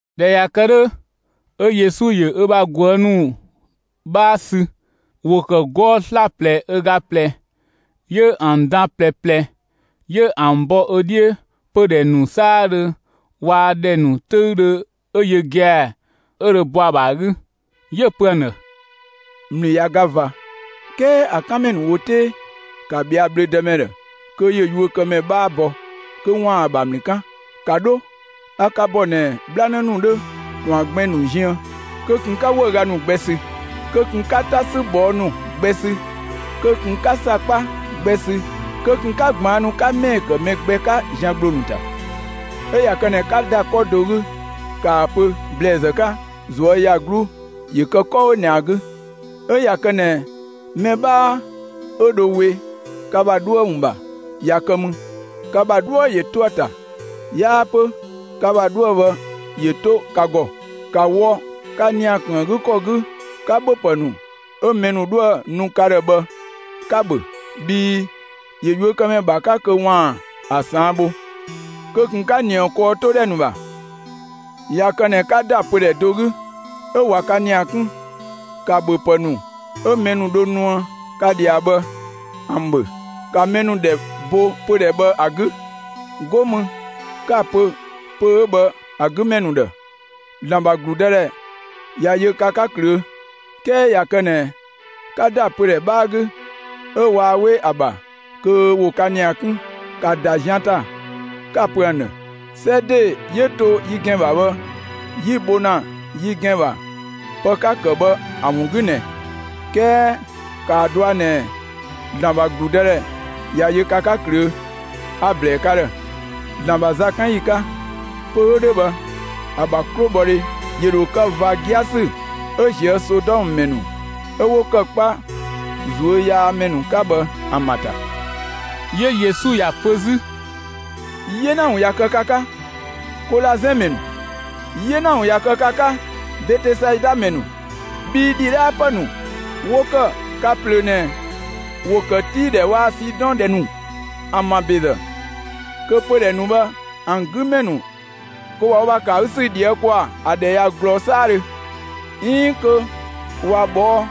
꞊Dhɛ ꞊ya kë 'dhö, 'ö Yesu ‑yö ö bha ꞊guë' ‑nu 'bhaa ‑sü; ‑wo ‑kë 'gɔɔ‑ 'slaplɛ ö ga ꞊plɛ, 'yö ‑an dan ꞊plɛ ꞊plɛ, 'yö ‑an bɔ ö 'dhiö pödhɛ ‑nu 'saadhö waa‑ ‑dhɛ ‑nu 'töüdhö 'ö yö gia‑ 'ö dho bɔ ‑a ‑bha ‑a 'gü. 'Yö‑ pö ‑an ‑dhë: «‑Mlü ꞊ya ga ꞊va, 'kɛɛ ‑a 'kanmɛ ‑nu ‑wo 'tee. ‑Ka ꞊bhɛa'‑ bhlö‑ dëmɛ ‑dhë kö ‑yö yuökëmɛ 'bhaa bɔ kö ‑waan ‑a ‑bha ‑mlü 'kan. ‑Ka 'dho! A ka ‑bɔ ꞊nɛ 'bhlanë ‑nu 'dhö ‑tɔn ‑bha gbɛn‑ ‑nu ziën. Kö ꞊kun 'ka 'wëüga ‑nu gbɛ sü; kö ꞊kun 'ka 'ta 'sü ꞊bhɔɔ' ‑nu gbɛ sü; kö ꞊kun 'ka ‑sakpa gbɛ sü; kö ꞊kun 'ka ꞊gbaannu 'ka ‑mɛɛ ‑kë mɛ gbɛ 'ka zian ‑gbloo ‑nu ‑ta. 'Ö ꞊ya kë ꞊nɛ 'ka ‑da 'kɔ do 'gü, ‑kaa ‑a pö ‑blɛɛzë 'ka: ꞊Zuöyagluu ‑yö kë 'kɔ 'ö ꞊nɛ ‑a 'gü! 'Ö ꞊ya kë ꞊nɛ mɛ 'bhaa 'ö dho we ka ‑bha 'dhuë‑ ‑wun ‑bha ꞊ya kë mü, ka ‑bha 'dhuë‑ ‑yö 'to ‑a ‑ta; 'yaa 'pö ka ‑bha 'dhuë‑ bhë ‑yö 'to ka ‑gɔ. ‑Ka wɔ ka ‑nia ‑kun ‑a 'gü ‑kɔ 'gü 'ka ‑bhöpë ‑nu 'ö mɛ ‑nu 'dhoë‑ nu ka ‑dhë bhë 'ka‑ ‑bhö, bhii ‑yö yuökëmɛ ‑bha 'ka kö ‑waan ‑a ꞊saan' bho. Kö ꞊kun 'ka ‑nië kɔɔtodhɛ ‑nu ‑bha! ꞊Ya kë ꞊nɛ 'ka ‑da pödhɛ do 'gü, 'ö ꞊wa ka ‑nia 'kun, ‑ka ‑bhöpë ‑nu 'ö mɛ ‑nu dho nuë ka ꞊dhia bhë ‑an ‑bhö. ‑Ka mɛ ‑nu ‑dhɛ bo pödhɛ bhë ‑a 'gü, 'go mü 'ka‑ pö pö‑ 'ö bhë ‑a 'gü ‑mɛ ‑nu ‑dhë: ‑Zlan ‑bha ‑gludëdhɛ ꞊ya yö ka 'ka ꞊klöö'. 'Kɛɛ ꞊ya kë ꞊nɛ 'ka ‑da pödhɛ 'bhaa 'gü 'ö waa 'we ‑a ‑bha kö ‑wo ka ‑nia 'kun, ‑ka ‑da zian ‑ta 'ka‑ pö ‑an ‑dhë: 'Sɛ ‑de 'yö to yi ‑gɛn ‑bha bhë 'yi‑ bho ‑na yi ‑gɛn ‑bha pë 'ka‑ ‑kë bhë ‑a ‑wun 'gü ꞊nɛ, 'kɛɛ ‑kaa dɔa ꞊nɛ ‑Zlan ‑bha ‑gludëdhɛ ꞊ya yö ka 'ka ꞊klöö'. A‑ ‑blɛɛ ka ‑dhë: ‑Zlan ‑bha zakanyi 'ka, pö‑ 'ö 'dhö bhë ‑a ‑bha 'klobhɔdhe ‑yö ‑dho kë ꞊va 'giasü 'ö ꞊zië' Sodɔmë ‑mɛ ‑nu 'ö 'wo ‑kë 'kpa ꞊zuö' yaa ‑mɛ ‑nu 'ka bhë ‑an ‑bha ‑ta!» 'Yö Yesu ‑ya pö 'zü: «'Yena ‑wun ꞊ya kë ka 'ka, Kolazɛn ‑mɛ ‑nu! 'Yena ‑wun ꞊ya kë ka 'ka, Betesaida ‑mɛ ‑nu! Bhii ‑dhidhaapë ‑nu 'wo ‑kë ka ꞊plöö ꞊nɛ, ‑wo ‑kë Tii ‑dhɛ waa‑ Sidɔn ‑dhɛ ‑nu ‑an ‑bha ‑bezë, kö pödhɛ ‑nu bhë ‑an 'gü ‑mɛ ‑nu ꞊wa wo ‑bha ‑kë ‑a 'gü ‑sü ꞊dhië' ‑kwaa ‑a ‑dhɛ ꞊ya ꞊glɔɔ 'saadhö, 'iin kö ꞊wa ꞊bhɔɔ'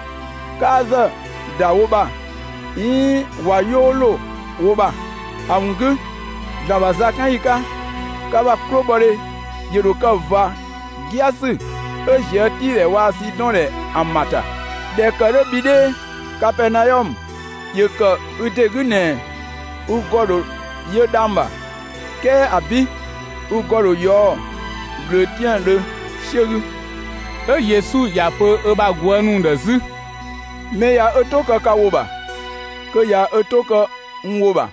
'kaazë ‑da wo ‑bha 'iin ꞊wa 'yoo ‑lo wo ‑bha. ‑A ‑wun 'gü, ‑Zlan ‑bha zakanyi 'ka, ka ‑bha 'klobhɔdhe ‑yö ‑dho kë ꞊va 'giasü 'ö ꞊zië' Tii ‑dhɛ waa‑ Sidɔn ‑dhɛ ‑an ‑bha ‑ta. ꞊Dhɛ ‑kë 'dhö bhi 'dhee, Kapɛɛnaɔmë, ‑yö ‑kë ü ‑de 'gü ꞊nɛ ü ‑gɔ ‑dho yö dhang‑ ‑bha! 'Kɛɛ ‑abi'! Ü ‑gɔ ‑dho ꞊yɔɔ'‑ ꞊glöötiaandhö 'siö 'gü.» 'Ö Yesu ‑ya pö ö bha ꞊guë' ‑nu ‑dhë 'zü: «Mɛ ꞊ya ö 'to kë ka ‑wo ‑bha, kö ꞊ya ö 'to kë n ‑wo ‑bha;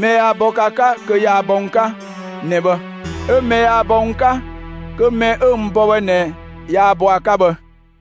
mɛ yaa bɔ ka 'ka kö yaa bɔ n 'ka ꞊nɛ bhë; 'ö mɛ yaa bɔ n 'ka, kö mɛ 'ö n bɔ bhë ꞊nɛ yaa bɔ ‑a 'ka bhë.»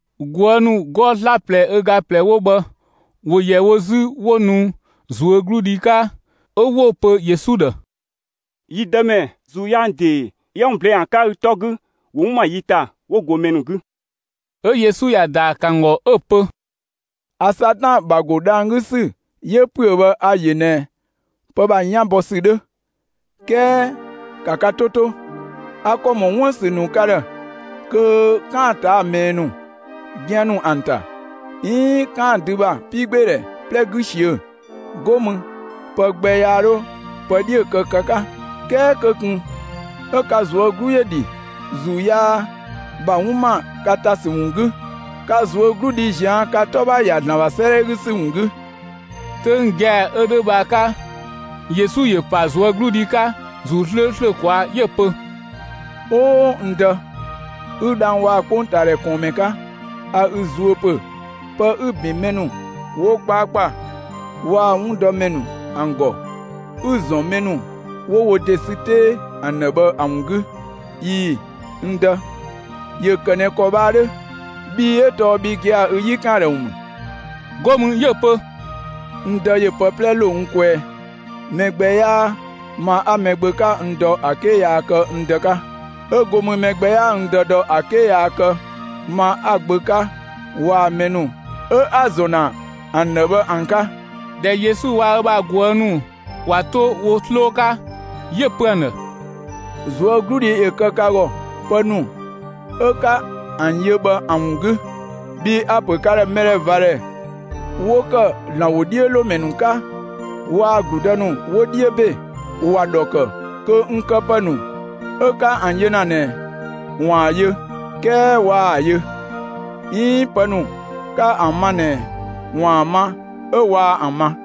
꞊Guë' ‑nu 'gɔɔ‑ 'slaplɛ ö ga ꞊plɛ 'wo bhë ‑wo ‑yɛ wo 'zü 'wo nu ꞊zuögludhi 'ka, 'ö 'wo‑ pö Yesu ‑dhë: «Yi Dëmɛ, ‑zuu yaa ‑nu ‑de 'yië 'wun ꞊blɛɛ'‑ ‑an 'ka ü 'tɔ 'gü, ‑wo 'wun ‑ma yi ‑ta 'wo go mɛ ‑nu 'gü.» 'Ö Yesu ꞊ya ‑daa ‑kë ‑an ‑gɔ 'ö‑ pö: «A Satan ‑bha ‑go dhang‑ 'gü ‑sü 'yö ‑püö bhë ‑a ‑yö ꞊nɛ pë ‑bha 'yan bɔ ‑sü 'dhö. 'Kɛɛ ‑ka ka 'to 'to: A ‑kɔ ‑mɔ 'wun ‑bha ‑sü ‑nu ka ‑dhë kö 'kaan‑ ꞊taa'‑ ꞊mɛɛ ‑nu, gian ‑nu ‑an ‑ta, 'iin 'kaan‑ dü ‑bha 'piigbeedhɛ 'plɛ 'gü ꞊siö'‑; 'go mü pë gbɛ yaa 'dho pë 'dhiö‑ kë ka 'ka. 'Kɛɛ kö ꞊kun 'ö ka ꞊zuö' 'glu ‑yö 'dhi, ‑zuu yaa ‑bha 'wun ‑ma ka ‑ta ‑sü ‑wun 'gü; ka ꞊zuögludhi ꞊zian' ka 'tɔ ‑bha ‑ya ‑Zlan ‑bha 'sëëdhɛ 'gü ‑sü ‑wun 'gü!» 'Töng gia‑ 'ö 'dhö bhë ‑a 'ka, Yesu ‑yö ‑pa ꞊zuögludhi 'ka ‑Zuu 'slööslö ꞊kwaa' 'yö‑ pö: «O n Dë, 'ü dhang‑ waa‑ 'kpongtaadhɛ ꞊kɔɔnmɛ 'ka, a ü zuö ‑pö pë 'ü‑ ‑bin mɛ ‑nu 'wo 'kpaakpa waa‑ 'wundɔmɛ ‑nu ‑an ‑gɔ, 'ü‑ ‑zɔn mɛ ‑nu 'wo wo ‑de ‑sü 'tee ‑an ‑dhë bhë ‑a ‑wun 'gü; ꞊ii‑, n Dë, ‑yö ‑kë ꞊nɛ ‑kɔ bhë ‑a 'dhö, bhii 'ö tɔɔ bhi gia‑ ü 'yi ‑kan ‑a ‑dhë ‑wun ‑mü.» 'Go mü 'yö‑ pö: «N Dë ‑yö pë 'plɛ ‑lo n kwɛɛ; mɛ gbɛ 'yaa ma 'a‑ Gbö 'ka n dɔ ‑a 'ke yaa kë n Dë 'ka. 'Ö go mü mɛ gbɛ 'yaa n Dë dɔ ‑a 'ke yaa kë ma 'a‑ Gbö 'ka waa‑ mɛ ‑nu 'ö 'a‑ ‑zɔn ‑na ‑an ‑dhë bhë ‑an 'ka.» ꞊Dhɛ Yesu waa‑ ö bha ꞊guë' ‑nu ꞊wa 'to wo 'sloo 'ka, 'yö‑ pö ‑an ‑dhë: «꞊Zuögludhi ‑yö kë ka ‑gɔ, pë ‑nu 'ö 'ka ‑an yö bhë ‑an ‑wun 'gü, bhii a‑ ‑pö ka ‑dhë mɛdhɛvadhɛ 'wo ‑kë ‑Zlan ‑wodhiölomɛ ‑nu 'ka waa‑ ‑gludë ‑nu 'wo 'dhiö ‑be, ‑wa ‑dhɔ ‑kë kö n këpë ‑nu 'ö 'ka ‑an yö ‑na ꞊nɛ 'waan‑ ‑an yö 'kɛɛ waa ‑an yö; 'iin pë ‑nu 'ka ‑an ma ꞊nɛ 'waan‑ ‑an ma 'ö waa ‑an ma.»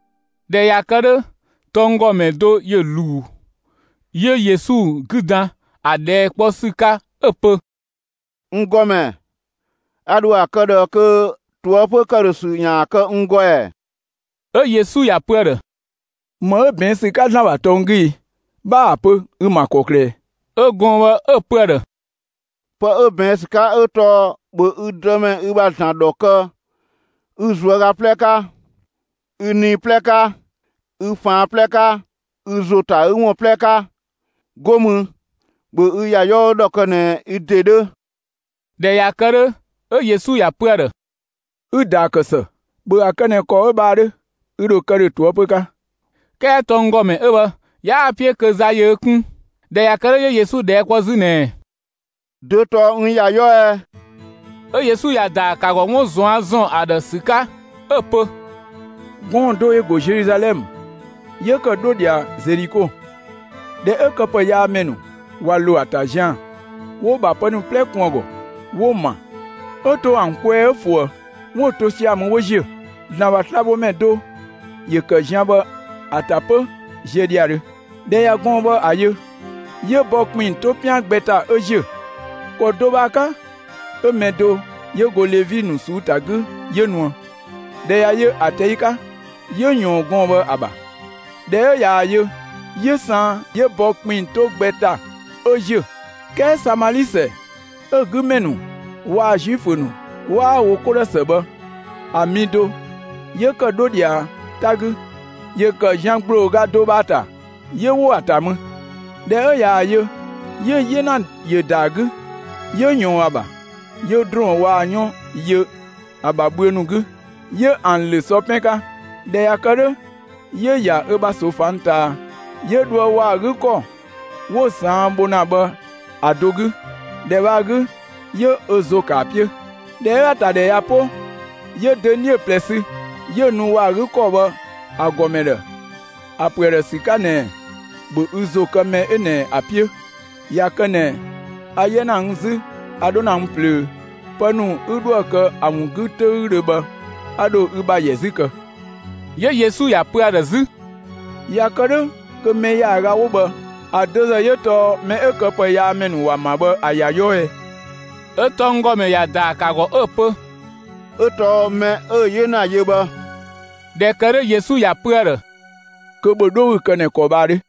꞊Dhɛ ꞊ya kë 'dhö, tɔnggɔmɛ do ‑yö ‑luu 'yö Yesu 'gü dan ‑a ꞊dhɛɛ' 'kpɔ ‑sü 'ka 'ö‑ pö: «N ‑Gɔmɛ, a ‑dho ‑a kë ꞊dhë kö ꞊toëpö ‑këdhösü ‑yaan kë n ‑gɔ ‑ɛ?» 'Ö Yesu ‑ya pö ‑a ‑dhë: «‑Më 'ö ꞊bɛɛn' ‑sü 'ka ‑Zlan ‑bha tɔng 'gü i? 'Bha ‑a pö, ü‑ ‑ma ‑kɔklë ꞊ɛ?» 'Ö gɔɔn‑ bhë 'ö‑ pö ‑a ‑dhë: «Pë 'ö ꞊bɛɛn' ‑sü 'ka 'ö tɔɔ: ‑Bhö ü Dëmɛ ü ‑bha ‑Zlan ‑dhɔ kë ü ꞊zuöga 'plɛ 'ka, ü nii 'plɛ 'ka, ü ꞊faan' 'plɛ 'ka, ü ‑zo ‑ta 'gü ‑wun 'plɛ 'ka! 'Go mü, ‑bhö ü ‑ya 'yɔɔ ‑dhɔ kë ꞊nɛ ü ‑de 'dhö!» ꞊Dhɛ ꞊ya kë 'dhö, 'ö Yesu ‑ya ‑pö ‑a ‑dhë: «Ü‑ ‑daa ‑kë ‑së, ‑bhö ‑a kë ꞊nɛ ‑kɔ 'ö bhë ‑a 'dhö, ü ‑dho kë ‑dhö ꞊toëpö 'ka!» 'Kɛɛ tɔnggɔmɛ 'ö bhë 'yaa‑ 'piö kö za ‑yö ö 'kun. ꞊Dhɛ ꞊ya kë 'dhö, 'yö Yesu ꞊dhɛɛ' kpɔ 'zü ꞊nɛɛ: «Dö tɔɔ n ‑ya 'yɔɔ ꞊ɛ?» 'Ö Yesu ‑ya ‑daa ‑kë ‑a ‑gɔ 'wun ꞊zuan' ‑zɔn ‑a ‑dhë ‑sü 'ka, 'ö‑ pö: «Gɔɔn‑ do ‑yö ‑go Zeluzalɛmë, 'yö ‑kë 'dho ꞊dhia Zeliko. ꞊Dhɛ 'ö këpëyaamɛ ‑nu ꞊wa ‑lo ‑a ‑ta zian‑, 'wo‑ ‑bha pë ‑nu 'plɛ kun ‑a ‑gɔ 'wo‑ ‑ma, 'ö to ‑an kwɛɛ 'ö ꞊fuë. 'Wo‑ to sia‑ mü 'wo ‑ziö. ‑Zlan ‑bha slabhomɛ do ‑yö ‑kë zian bhë ‑a ‑ta 'pö ziö ‑dhiadhö. ꞊Dhɛ ꞊ya gɔɔn‑ bhë ‑a yö, 'yö bɔ ‑kpinng 'to 'pian gbɛ ‑ta, 'ö ‑ziö. ‑Kɔ do bhë ‑a 'ka 'ö mɛ do 'yö go Levi ‑nu ꞊suu'‑ 'gü 'yö nuë. ꞊Dhɛ ꞊ya yö ‑a ꞊tɛi' 'ka, 'yö ꞊yɔɔn gɔɔn‑ bhë ‑a ‑bha. ꞊Dhɛ 'ö ꞊yaa‑ yö, 'yö saan 'yö bɔ ‑kpinng 'to gbɛ ‑ta 'ö ‑ziö. 'Kɛɛ Samali (‑sɛ 'ö‑ 'gü ‑mɛ ‑nu waa‑ Zuifö ‑nu 'waa wo 'ko ‑dhë ‑së bhë ‑a) mi do 'yö ‑kë 'dho ꞊dhia 'ta 'gü; ‑yö ‑kë zian ‑gblooga do bhë ‑a ‑ta; 'yö ‑wo ‑a ‑ta mü. ꞊Dhɛ 'ö ꞊yaa‑ yö, 'yö‑ 'yena ‑yö ‑da ‑a 'gü, 'yö ꞊yɔɔn ‑a ‑bha, 'yö ‑drɔɔn waa‑ 'yɔn yö ‑a ‑bha bhüö ‑nu 'gü, 'yö ‑an ‑lö sɔ 'pɛn 'ka. ꞊Dhɛ ꞊ya kë 'dhö, 'yö‑ ‑ya ö bha ꞊soofang ꞊taa 'yö dhoë ‑wɔ ‑a 'gü ‑kɔ 'wo‑ ꞊saan' bho ‑na bhë ‑a do 'gü. ‑Dhɛ bhë ‑a 'gü, 'yö ö ‑zo ‑kë ‑a 'piö. ꞊Dhɛ 'ö ‑a ‑tadhɛ ꞊ya 'po, 'yö dönie ꞊plɛ sü 'yö‑ nu ‑wɔ ‑a 'gü ‑kɔ bhë ‑a ‑gɔmɛ ‑dhë ‑a pö ‑a ‑dhë ‑sü 'ka ꞊nɛɛ: ‹‑Bhö ü ‑zo kë mɛ 'ö ꞊nɛ ‑a 'piö; ꞊ya kë ꞊nɛ a 'yɛ ‑na n 'zü a 'dho ‑na n ꞊plöö, pë ‑nu 'ü 'dhoë‑ kë ‑a ‑wun 'gü 'töüdhö bhë a ‑dho ü ‑bha ‑yɛ 'zü kë.›» 'Yö Yesu ‑ya pö ‑a ‑dhë 'zü: «꞊Ya kë 'dhö kö mɛ ‑yaaga 'wo bhë ‑a dö ‑zë 'yö tɔɔ mɛ 'ö këpëyaamɛ ‑nu ‑wa ‑ma bhë ‑a ‑ya 'yɔɔ ꞊ɛ?» 'Ö tɔnggɔmɛ ‑ya ‑daa ‑kë ‑a ‑gɔ 'ö‑ pö: «'Ö tɔɔ mɛ 'ö‑ 'yena yö bhë.» ꞊Dhɛ ‑kë 'dhö Yesu ‑ya pö ‑a ‑dhë: «Kö ‑bhö 'dho 'ü‑ kë ꞊nɛ ‑kɔ bhë ‑a 'dhö!»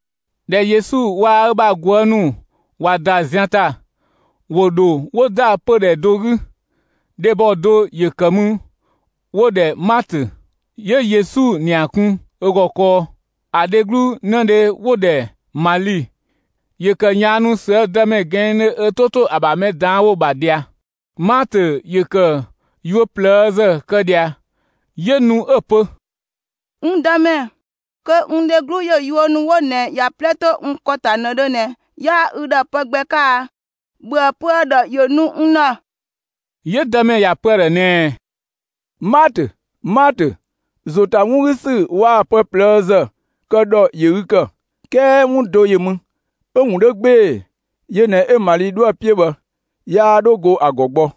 ꞊Dhɛ Yesu waa‑ ö bha ꞊guë' ‑nu ꞊wa ‑da zian ‑ta, ‑wo ‑dho 'wo ‑da pödhɛ do 'gü. Dhebɔ do ‑yö ‑kë mü, 'wo‑ ‑dhɛ Maatö; 'yö Yesu ‑nia kun ö ‑gɔ kɔɔ. ‑A dheglu 'nëdhe 'wo‑ ‑dhɛ Mali, ‑yö ‑kë ꞊yaannu ꞊süë' Dëmɛ ꞊gɛɛndhö ö 'to ‑to ‑a ‑bha ‑mɛ ꞊daan' ‑wo ‑bha ꞊dhia. Maatö ‑yö ‑kë yuö ꞊plëëzë kë ꞊dhia, 'yö nu 'ö‑ pö: «N Dëmɛ, kö n dheglu ‑yö yuö ‑nu 'wo ꞊nɛ ‑ya 'plɛ 'to n ‑kɔ ‑ta ꞊nëdhö ꞊nɛ, 'yaa ü ‑dhë pë gbɛ 'ka a? ‑Bhöë pö ‑a ‑dhë ‑yö nu n ‑dhë!» 'Yö Dëmɛ ‑ya ‑pö ‑a ‑dhë ꞊nɛɛ: «Maatö, Maatö, ‑zo ‑ta 'wun 'gü ‑sü waa‑ pë ꞊plëëzë kë ‑dhɔ ‑yö ü ‑kë, 'kɛɛ 'wun do ‑yö mü, 'ö‑ ‑wun 'dhö 'gbee‑. Yö ꞊nɛ 'ö Mali 'dhoë‑ 'piö bhë; yaa 'dho 'go ‑a ‑gɔ gbɔ.»